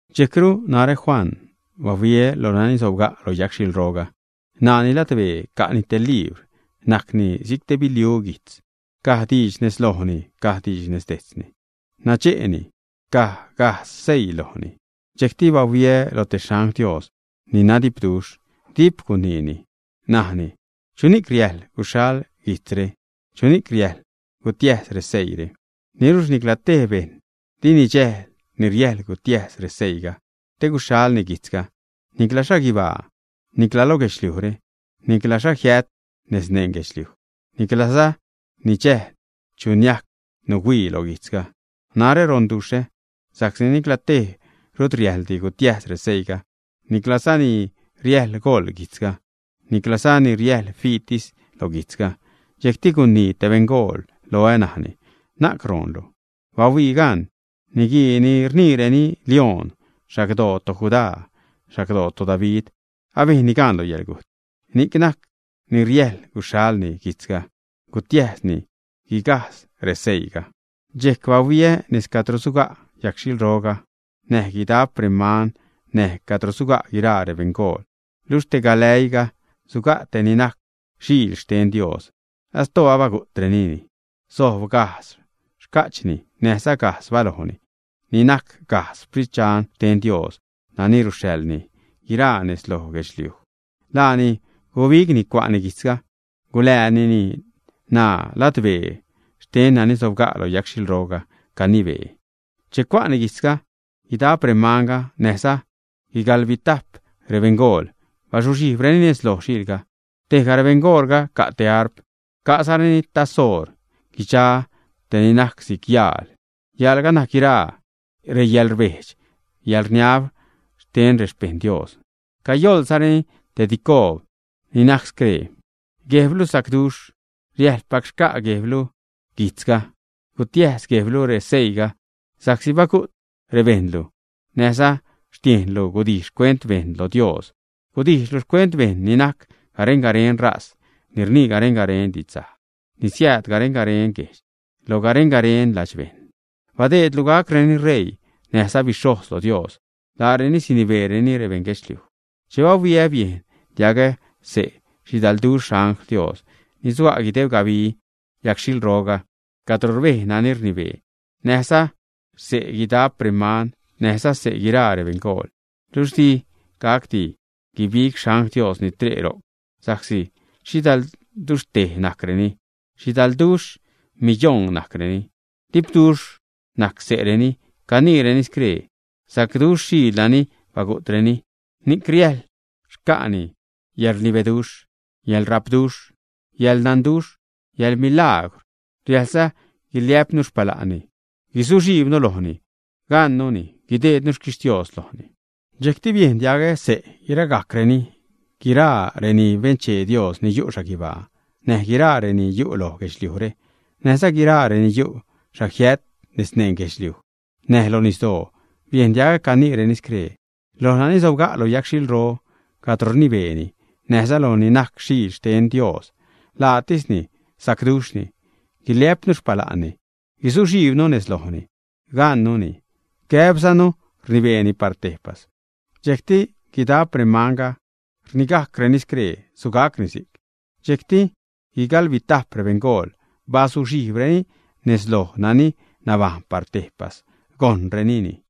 Dxejcru narä Juan bahuiä lo nani sobga' lo yagxhilroga. N̲aani ladbee ca'ni te libr, najcni si'c te biliu guijtz. Caj diidx nez lojni caj diidx nez dejtzni, nadxe'ni, caj gajdz seii lojni. Dxejcti bahuiä lo te xangl Dios ni nadipduxh, dip guniini, najni: ―¿Chuni'c riäjḻ guxhal guijtzre? ¿Chuni'c riäjḻ gutiäjs reseiire? Niluxh nicla tej bejṉ di nidxäjl ni riäjḻ gutiäjs reseiiga te guxhalni guijtzga; nicla xhaguibaa, nicla lo guedxliujre, nicla xhajiät nez neṉ guedxliuj. Niclaza nidxäjl chu niajc nuhuii lo guijtzga. Narä ronduxhä sa'csi nicla tej rut riäjḻdi gutiäjs reseiiga, niclaza ni riäjḻ goḻ guijtzga, niclaza ni riäjḻ fiitis lo guijtzga. Dxejcti gunii te beṉgool loä, najni: ―Na'cru goonlu. Bahuii gan, niguii ni rniireni Lioṉ, xagdoo toJudá, xagdoo toDavid, abejnni gaan lo yäḻgujt ni'c ṉaj riäjḻ guxhalni guijtzga, gutiäjszani guigajdz reseiiga. Dxejc bahuiä nez cadro suga' yagxhilroga näj guidap remanga, näj cadro suga' guiraa rebeṉgool luxh te galäiiga suga' tej ni najc Xiil xten Dios, astoo abagu'trenini. Sojb gajdz xca'chni näjza gajdz balojni, ni najc gajdz Sprit xten Dios nani ruxhaḻni guiraa nez lo guedxliuj. Laani gubigni, cua'ni guijtzga, guläänini ṉaa ladbee xten nani sobga' lo yagxhilroga canibee. Che cua'ni guijtzga, guidap remanga näjza guigaḻbitap rebeṉgool bazuxhijbreni nez loj Xiilga. Tejga rebeṉgoolga ca' te arp, ca'zareni taz oor guidxa te ni najc si'c yaal. Yaalga najc guiraa reyäḻrbejdx, yäḻrniab xten rexpejṉ Dios. Cayoḻzareni te dicoob ni najc scree: Guejblu sacduxh, riäjḻpac xca' Guejblu guijtzga, gutiäjs Guejblu reseiiga, sa'csi bagu't rebejṉlu, näjza xtiejnlu gudijx xcuent bejṉ lo Dios. Gudijxlu xcuent bejṉ ni najc garen-garen ṟaz, ni rnii garen-garen didxsaj, ni siääd garen-garen guejdx lo garen-garen ladxbejṉ. Badeedlu gacreni ṟeii näjza bixhojz lo Dios. Laareni sinibeereni rebeṉ guedxliuj. Che bahuiä, biejn diagä xse' xhidalduxh xangl Dios ni suga' guideb gabi yagxhilro cadro rbej nani rnibee, näjza xse' guidap reman, näjza xse' guiraa rebeṉgool. Luxh di gacdi guigab xangl Dios ni tre' ro'c sa'csi xhidalduxhtej najcreni, xhidalduxh miyoṉ najcreni. Dipduxh najc xse'reni, caniireni scree: Sacduxh Xiil nani bagu'treni, ni'c riäjḻ xca'ni yäḻrnibeduxh, yäḻrapduxh, yäḻnanduxh, yäḻmilagwr. Riäjlza guiliä'pnu xpala'nni, guzuxhijbnu lojni gaṉnuni, gudeednu xquixtios lojni. Dxejcti biejn diagä xse' guiragajcreni, guiraa reni benchee Dios ni yu' xhaguibaa, näj guiraa reni yu' loj guedxliujre, näjza guiraa reni yu' xhajiät nez neṉ guedxliuj näj lo nisdoo, biejn diagä caniireni scree: Loj nani sobga' lo yagxhilro cadro rnibeeni, näjza loj ni najc Xiil xten Dios, laatisni sacduxhni, guiliä'pnu xpala'nni, guzuxhijbnu nez lojni gaṉnuni, gäbzanu rinibeeni par tejpas. Dxejcti guidap remanga rnigajcreni scree: ―Sugacni si'c. Dxejcti guigaḻbitap rebeṉgool bazuxhijbreni nez loj nani nabajṉ par tejpas, gojṉrenini.